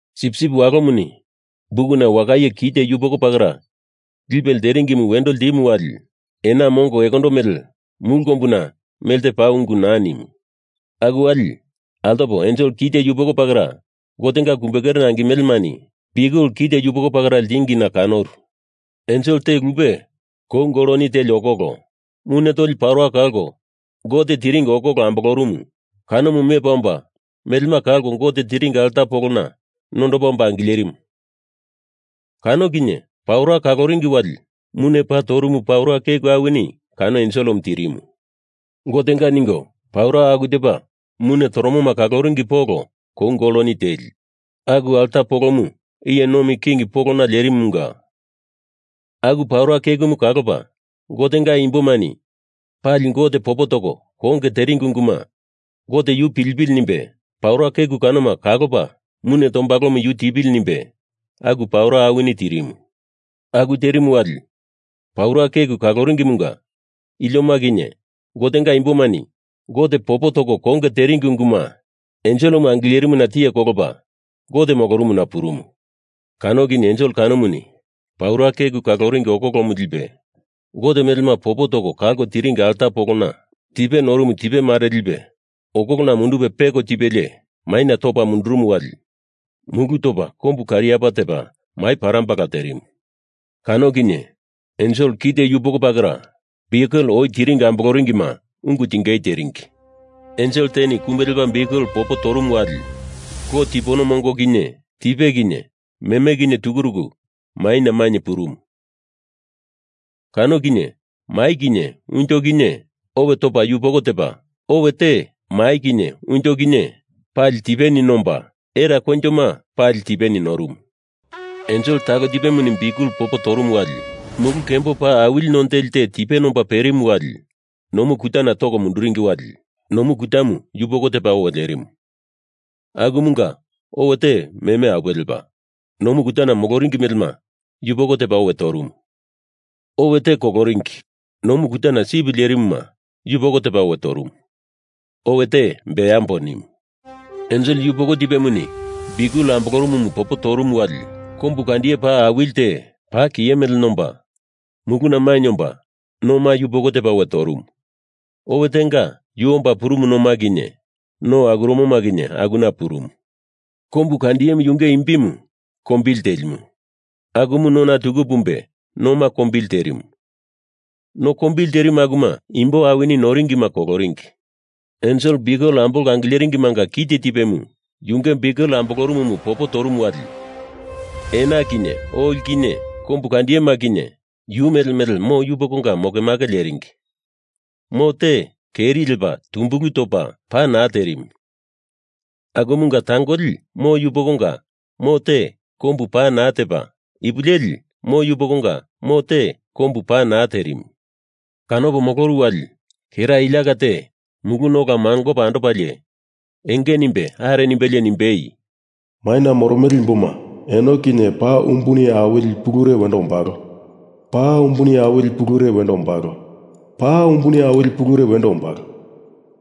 Sipsip Walomuni bukuna wakaye kite yupoko pakera lipe lteringimu wendo ltimu wali ena mongo ekondo mele mulu kombuna melte paa ungu naa nimu. Aku wali altopo ensel kite yupoko pakera Gotenga kumbe kerena angimelemani biukel kite yupoko pakera ltingina kanoru. Ensel te lupe kou goloni teli okoko, mune toli paura kalko Gote tiringi okoko ambolorumu kanomu mepa omba melema kalko Gote tiringi alta polona nondopa omba angilerimu. Kano kinye paura kaloringi wali mune paa torumu paura keku awini kano enselemu tirimu. Gotenga ningo paura aku tepa mune toromoma kaloringi polo kou goloni teli, aku alta polomu iye nomi king polona lerimumunga aku paura kekumu kalopa Gotenga imbomani pali Gote popo toko konge teringi unguma Gote yu pilipili nimbe paura keku kanoma kalopa mune tombalomu yu tipili nimbe aku paura awini tirimu. Aku terimu wali paura keku kalorumumunga ilioma kinye Gotenga imbomani Gote popo toko konge teringi unguma enselemu angilerimuna tiye kolopa Gote molorumuna purumu. Kano kinye ensel kanomuni paura keku kaloringi okokomu lipe, Gote melema popo toko kalko tiringi alta polona tipe norumu tipe mare lipe okolona mundupe peko tipelie maina topa mundurumu wali mulu topa kombu kariapa tepa mai parambala terimu. Kano kinye ensel kite yupoko pakera biukel oi tiringi amboloringima ungu tingei teringi. Ensel teni kumbe lepa biukel popo torumu wali lo tipono mongo kinye tipe kinye meme kinye tukuruku maina mainye purumu. Kano kinye mai kinye unjo kinye owe topa yupoko tepa, owe te mai kinye unjo kinye pali tipeni nomba, era koinjoma pali tipeni norumu. Ensel talo tipemuni biukel popo torumu wali mulu kembo paa awili none teli te tipe nomba perimu wali nomu kutana toko munduringi wali nomu kutamu yupoko tepa owe lerimu, akumunga owe te meme apuwe lepa, nomu kutana moloringi melema yupoko tepa owe torumu, owe te koloringi, nomu kutana sip lerimuma yupoko tipe owe torumu, owe te beambo nimu. Ensel yupoko tipemuni biukel ambolorumumu popo torumu wali kombu kandiye paa awili te, paa kiye mele nomba, muluna mainye omba noma yupoko tepa owe torumu, owe tenga yu omba purumu noma kinye no akuromoma kinye akuna purumu. Kombu kandiyemu yunge imbimu Kombili Telimu. Akumu nona tuku pumbe noma kombili terimu, no kombili terimu akuma imbo awini noringima koloringi. Ensel biukel ambolko angileringimanga kite tipemu yunge biukel ambolorumumu popo torumu wali ena kinye oli kinye kombu kandiyema kinye yu mele mele mo yupokonga mokemake leringi, mo te keri lepa tumbulu topa pa naa terimu, akumunga tangoli mo yupokonga mo te kombu pa naa tepa, ipu leli mo yupokonga mo te kombu pa naa terimu. Kanopo moloru wali kera iliaka te muluna ola mangopa andopalie enge nimbe are nimbelie nimbei, “Maina moromele imboma eno kinye paa umbuni awili pulure wendo ombalo, paa umbuni awili pulure wendo ombalo, paa umbuni awili pulure wendo ombalo.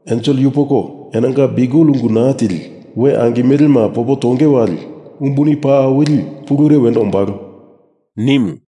Ensel yupoko enonga biukel ungu naa tili we angimelema popo tonge wali umbuni paa awili pulure wendo ombalo,” nimu.